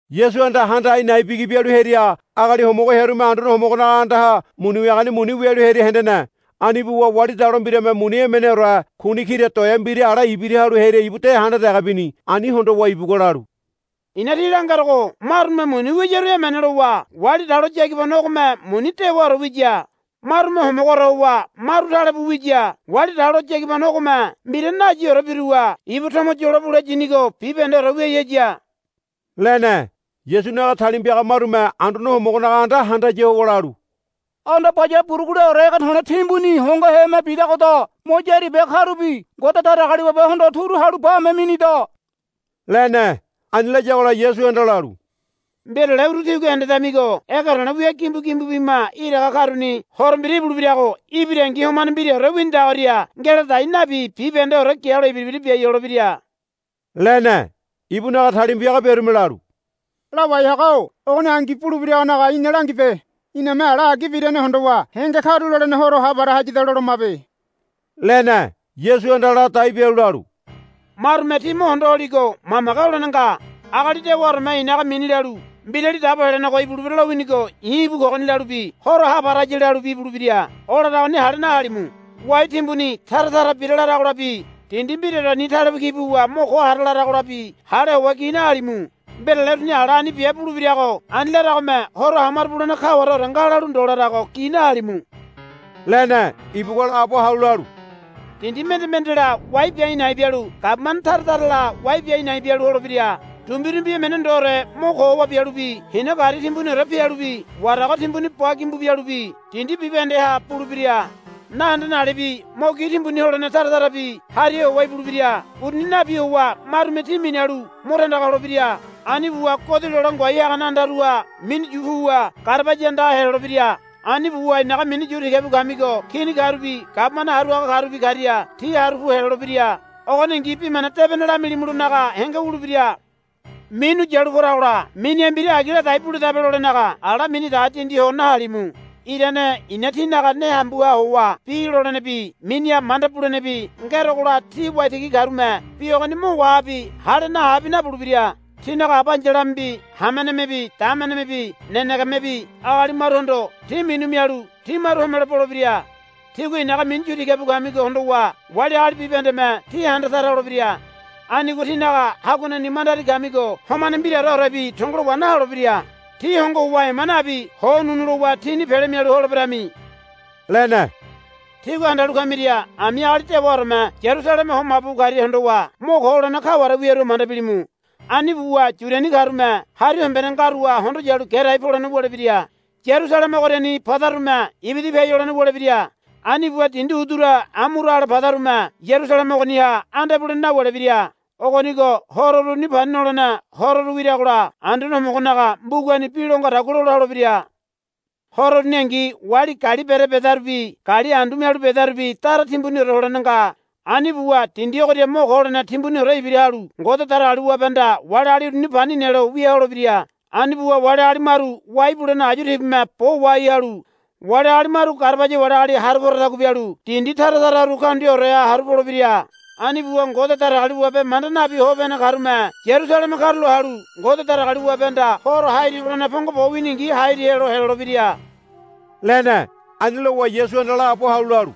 Yasuhanda handa a̱i̱ na̱i̱ bigi bialu hearia agali homogo hearume Anduane Homogonaga andaha muni wiagani muni wialu hearia hendene. Ani buwa wali dalo mbirame muni emeneore kuni kira toea mbira ale ibira halu hearia ibu de handa dege bini. Ani hondowa ibugua lalu, I̱na tí langerogo marume muni wiyaru emene lowa wali dalo yagibano ogome muni dewaore wiya. Marume homogoore howa maru tale buwa wiya. Wali dalo yagibano ogome mbira nayiore biruwa ibu tomo yolo bule yinigo bibahendeore wiai haya, lene. Yasunaga talima piaga marume Anduane Homogonaga anda handaya howa lalu, Anda baya buruguleore ege to̱le̱ timbuni hongoheme bidagoda. Mo yári bia karubi Ngode Datagaliwabehondo turu halu bame minida, lene. Ani layagola Yasuhanda lalu, Mbirale uru tígua hendedamigo ege to̱le̱ wia gimbu gimbu bima iraga karuni horo mbira ibulebirago ibirangi homane mbiraore winidagoria ngeladai nabi bibahendeore gialo ibira ibira biai holebira, lene. Ibunaga talima piaga biarume lalu, Lawai haga-o ogoni angi bulebiragonaga ina langibe. Iname ala agi birane hondowa henge karulolene horo ha para hayada lolomabe, lene. Yasuhanda ladai bialu lalu, Marume tí mo hondo holigo mamage holene nga. Agali dewaoreme i̱naga mini lalu, Mbirali Dabo Helenego ibulebira lowinigo i̱ íbu kogoni, lalubi, Horo ha para haya, lalubi ibulebira. O laragoni hale nahalimu. Wai timbuni tara tara bira, laragolabi, Dindi mbiraoreni talebu ki buwa mo ko hara, laragolabi hale howa gi nahalimu. Mbirale uruni ala ani bia bulebirago ani laragome horo hamaro bulene kawareore nga lalu ndo larago gi nahalimu, lene. Ibugua laabo halu lalu, Dindi mende mendela wai bia a̱i̱ na̱i̱ bialu gabumane tara tarala wai bia a̱i̱ na̱i̱ bialu holebira. Dumbirumbi emene ndoore mo ko howa bialubi hina gari timbuniore pialubi warago timbuni ba gimbu bialubi dindi bibahendeha bulebira. Nahendene alebi mo gi timbuni holene tara tarabi hariha howa ibulebira. Uruni nabi howa marume tí minalu mo tandaga holebira. Ani buwa godi lole ngoai hagane andaruha minu yu puwa garabaya andaha helolebira. Ani buwa i̱naga mini yu tiga bu kamigo kini karubi gabumane haru haga karubi karia tí haru pu helolebira. Ogoningi Bi Mana Debene lamilimulonaga henge wulebira. Minu yalu poragola miniha mbira agi ladai buledabe lolenaga ala mini dege dindi ho nahalimu. Irane i̱na tínaga ne hambuha howa bi lolenebi miniha manda bulenebi ngerogola tí waitigi karume bi ogoni mo wahabi hale nahabi nabulebira. Tínaga aba ai̱yalamebi hamenemebi damenemebi nenegemebi agali maruhondo tí minu mialu tí maru homelo bolebira. Tígua i̱naga mini yu tiga bu kamigo hondowa wali agali bibahendeme tí handa tara holebira. Anigo tínaga haguaneni mandari kamigo homane mbiraoreorebi tongolo wa naholebira. Tí hongo howa ema nabi ho ununu lowa tíni pele mialu holeberami, lene. Tígua handalu kamira ami agali dewaoreme Yarusaleme ho mabu bu karia hondowa mo ko holene kaware wiarua manda bilimu. Ani buwa Yudiani karume hari hombene ngaruha hondo yalu gerai polene wulebira. Yarusaleme ogoriani padarume ibida piai holene wulebira. Ani buwa dindi udura amura ale padarume Yarusaleme ogoniha anda ibulene nawulebira. Ogonigo horo uruni Pani Nolene Hororu wiragola Anduane Homogonaga mbugani bi lo ngadagua lola holebira. Horo uruningi wali gali bere bedarubi gali andu mialu bedarubi dara timbuniore holene nga. Ani buwa dindi ogoria mo ko holene timbuniore ibira halu Ngode Datagaliwabehanda wali agali uruni pani nelo wia holebira. Ani buwa wali agali maru wai bulene ayu tibume bo wahai halu wali agali maru garabaya wali agali haru poradagua bialu dindi tara tararu kaundiaoreha haru polebira. Ani buwa Ngode Datagaliwabe manda nabi hope hene karume Yarusaleme karulo halu Ngode Datagaliwabehanda horo hairi holene pongo bo winingi hairi helo helolebira, lene. Ani lowa Yasuhanda laabo halu lalu,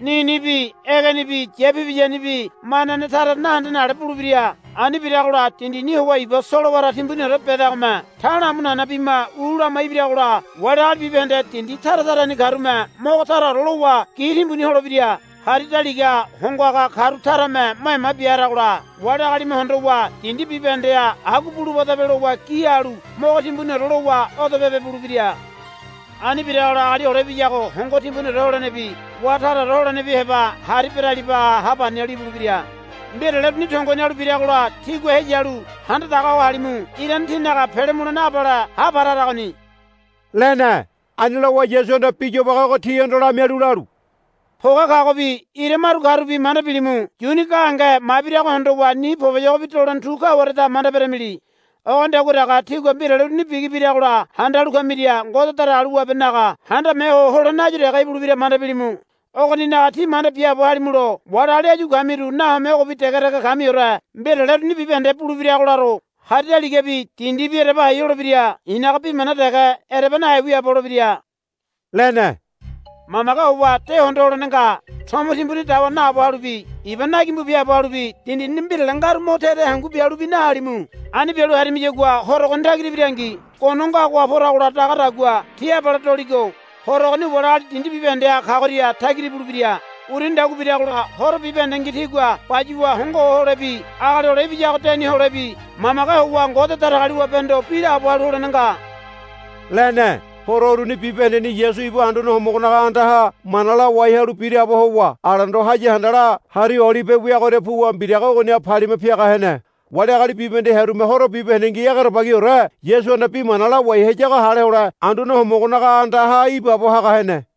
Ninibi egenibi yapibiyanibi manane tara nahendene ale bulebira. Ani biragola dindini howa iba solowara timbuniore bedagome ta̱la̱ amu nana bima u lama ibiragola wali agali bibahende dindi tara tarani karume mogo taraore lowa gi timbuni holebira. Hari daligaha hongo haga karu tarame mo ema bia haragola wali agalime hondowa dindi bibahendeha agua bulubadabe lowa gi halu mogo timbuniore lowa odo pebe bulebira. Ani biragola Agali Hole Ibiyago hongo timbuniore holenebi wá taraore holenebi heba hari beralibaha ha pani halu ibulebira. Mbirale uruni tongo hinalu biragola tígua heyalu handa daga ho halimu. Irane tínaga pele mulene abale ha para haragoni, lene. Ani lowa Yasuhanda bi yobage ogo tihondo lamialu lalu, Poge kagobi ira maru karubi manda bilimu. Yuni gahenge mabirago hondowa ni poboyogobi dolene tu kawareda manda beramili. Ogonidagua dege tígua mbirale uruni bigi biragola handalu kamiria Ngode Datagaliwabenaga Handame Ho Holene áyu dege ibulebira manda bilimu. Ogoninaga tí manda biaabo halimulo wali agali áyu kamiru nahome ogobi dege dege kamiore mbirale uruni bibahende bulebirago laro. Hari daligabi dindibi ereba hai holebira. I̱naga bi mana dege ereba nahe wiaabo holebira, lene. Mamage howa de hondo holene nga. Tomo timbuni dawa naabo halubi iba na gimbu biaabo halubi dindini mbirale ngaru mo te te hangu bialubi nahalimu. Ani bialu harimiyagua Horo ogoni tagira ibirangi gono ngagoha poragola dagadagua ti abale doligo. Horo ogoni wali agali dindi bibahendeha kagoria tagira ibulebira. Urunidagua biragola horo bibahendengi tígua bayuwa hongo ho holebi Agali Hole Ibiyago deni holebi mamage howa Ngode Datagaliwabehondo bi laabo halu holene nga, lene. Horo uruni bibahendeni Yasu ibu Anduane Homogonaga andaha mana lawai halu biraabo howa alendo haya handala Hari Olibe weagoria puwa mbiraga ogoniha palima piaga hene. Wali agali bibahende hearume horo bibahendengi egerebagiore Yasuhanda bi mana lawai hayago hale hole Anduane Homogonaga andaha ibaabo haga hene.